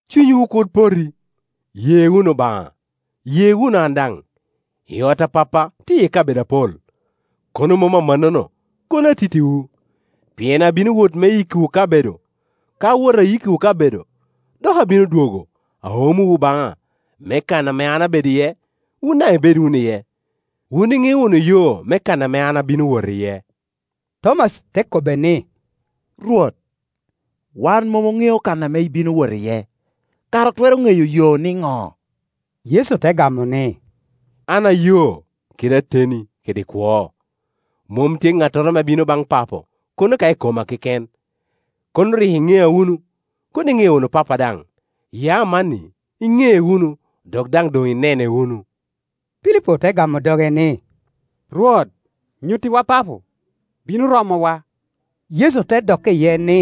“Cunywu kur poti; ye wunu Obaŋa, ye wunu an daŋ. I ot a Pappa tye iye kabedo apol; kono mom amannono, kono atittiwu, pien abino wot me yikkiwu kabedo. Ka awoto, ayikkiwu kabedo, dok abino dwogo, aomowu baŋa, me kan ame an abedo iye, wun daŋ ibed wunu iye. Wun iŋeo wunu yo me kan ame an abino wot iye.” Tomaci te kobbe ni, “Rwot, wan mom oŋeo kan ame ibino wot iye; kara otwero ŋeyo yo nino?” Yecu te gamo ni, “An ayo, kede ateni kede kwo; mom tye ŋattoro ame bino baŋ Papo, kono ka i koma keken. Kono rik iŋea wunu, kono iŋeo wunu Pappa daŋ; ya amanni iŋee wunu dok daŋ doŋ inene wunu.” Pilipo te gamo doge ni, “Rwot, nyuttiwa Papo, bino romowa.” Yecu te dokke iye ni,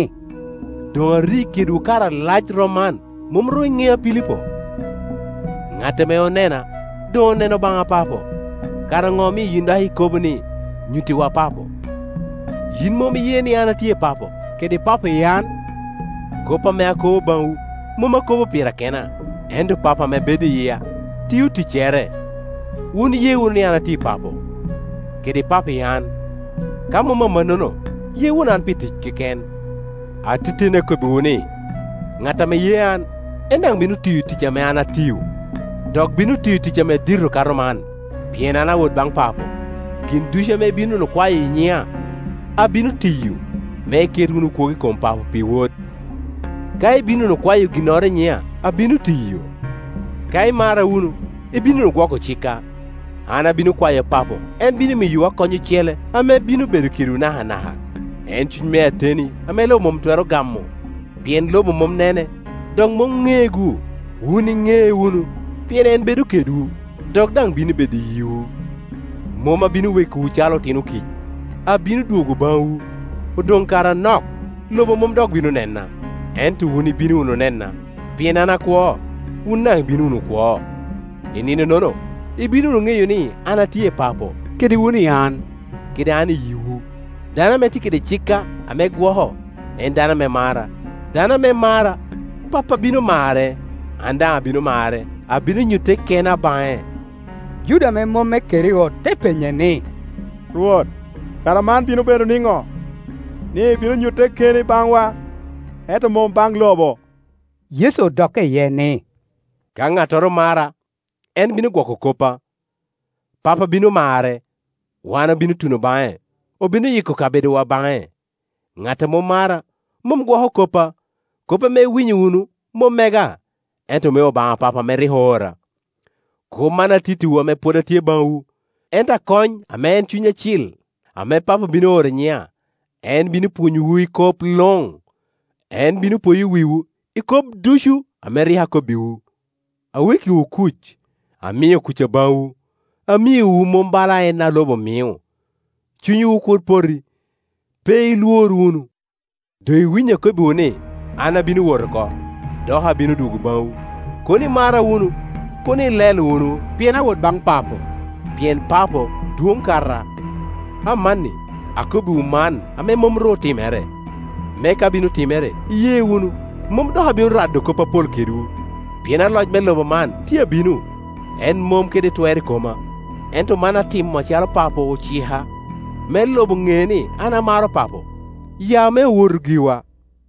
“Doŋ ari kedwu kare alac rom man, mom ru iŋea, Pilipo? Ŋat ame onena doŋ oneno Obaŋa Papo; kara ŋo omio yin dok ikobo ni, ‘Nyuttiwa Papo?’ Yin mom iye ni, an atye i Papo, kede Papo i an? Kop ame akobo baŋwu, mom akobo pira kena; ento Pa po ame bedo i yia tio ticcere. Wun ye wunu ni an atye i Papo, kede Papo i an; ka mom amannono, ye wunu an pi tic keken. “Ateteni akobbiwu ni, ŋat ame ye an, en daŋ bino tiyo tic ame an atio; dok bino tiyo tic ame dito kato man, pien an awot baŋ Papo. Gin ducu ame ibino wunu kwayo i nyina, abino tiyo, me iket wunu kwogo i kom Papo pi Wod; ka ibino wunu kwayo ginnoro i nyina, abino tiyo. “Ka imara wunu, ibino wunu gwoko cikka. An abino kwayo Papo, en bino miyowu Akony ocele ame bino bedo kedwu nakana ka, en Cuny me ateni ame lobo mom twero gamo, pien lobo mom nene, dok mom ŋee-gu. Wun iŋee wunu pien en bedo kedwu, dok daŋ bino bedo i yiwu. “Mom abino wekowu calo otino kic; abino dwogo baŋwu. Odoŋ kare anok, lobo mom dok bino nena, ento wun ibino wunu nena; pien an akwo, wun daŋ ibino wunu kwo. I ninonono ibino wunu ŋeyo ni an atye i Papo, kede wun i an, kede an i yiwu. Dano ame tye kede cikka, ame gwoko, en dano ame mara; dano ame mara, Pappa bino marre, an daŋ abino mare, abino nyutte kena baŋe.” Juda ame mom me Keriot te penye ni, “Rwot, kara man bino bedo nino, ni ibino nyutte keni baŋwa, ento mom baŋ lobo?” Yecu odokke iye ni, “Ka ŋattoro mara, en bino gwoko koppa, Pappa bino marre, wan obino tuno baŋe, obino yiko kabedowa baŋe. Ŋat a mom mara, mom gwoko koppa; kop ame iwinyo wunu mom mega, ento me Obaŋa Papo ame rik oora. “Kop man atittiwu ame pwod atye baŋwu. Ento Akony, ame en Cuny Acil, ame Papo bino oro i nyina, en bino pwonyowu i kop luŋ, en bino poyo wiwu i kop ducu ame rik akobbiwu. Awekkiwu kuc, amio kucca baŋwu, amiowu mom bala en a lobo mio. Cunywu kur poti, pe ilwor wunu. Doŋ iwinyo akobbiwu ni, ‘An abino wot oko, dok abino dwogo baŋwu.’ Kono imara wunu, kono ilelo wunu pien awot baŋ Papo, pien Papo dwon kata. Amanni akobbiwu man ame mom ru otimere, me ka bino timere, iye wunu. Mom dok abino rado kop apol kedwu, pien aloc me lobo man tye abino. En mom kede twer i koma; ento man atimo acalo Papo ocika, me lobo ni an amaro Papo. Ya me owotu giwa.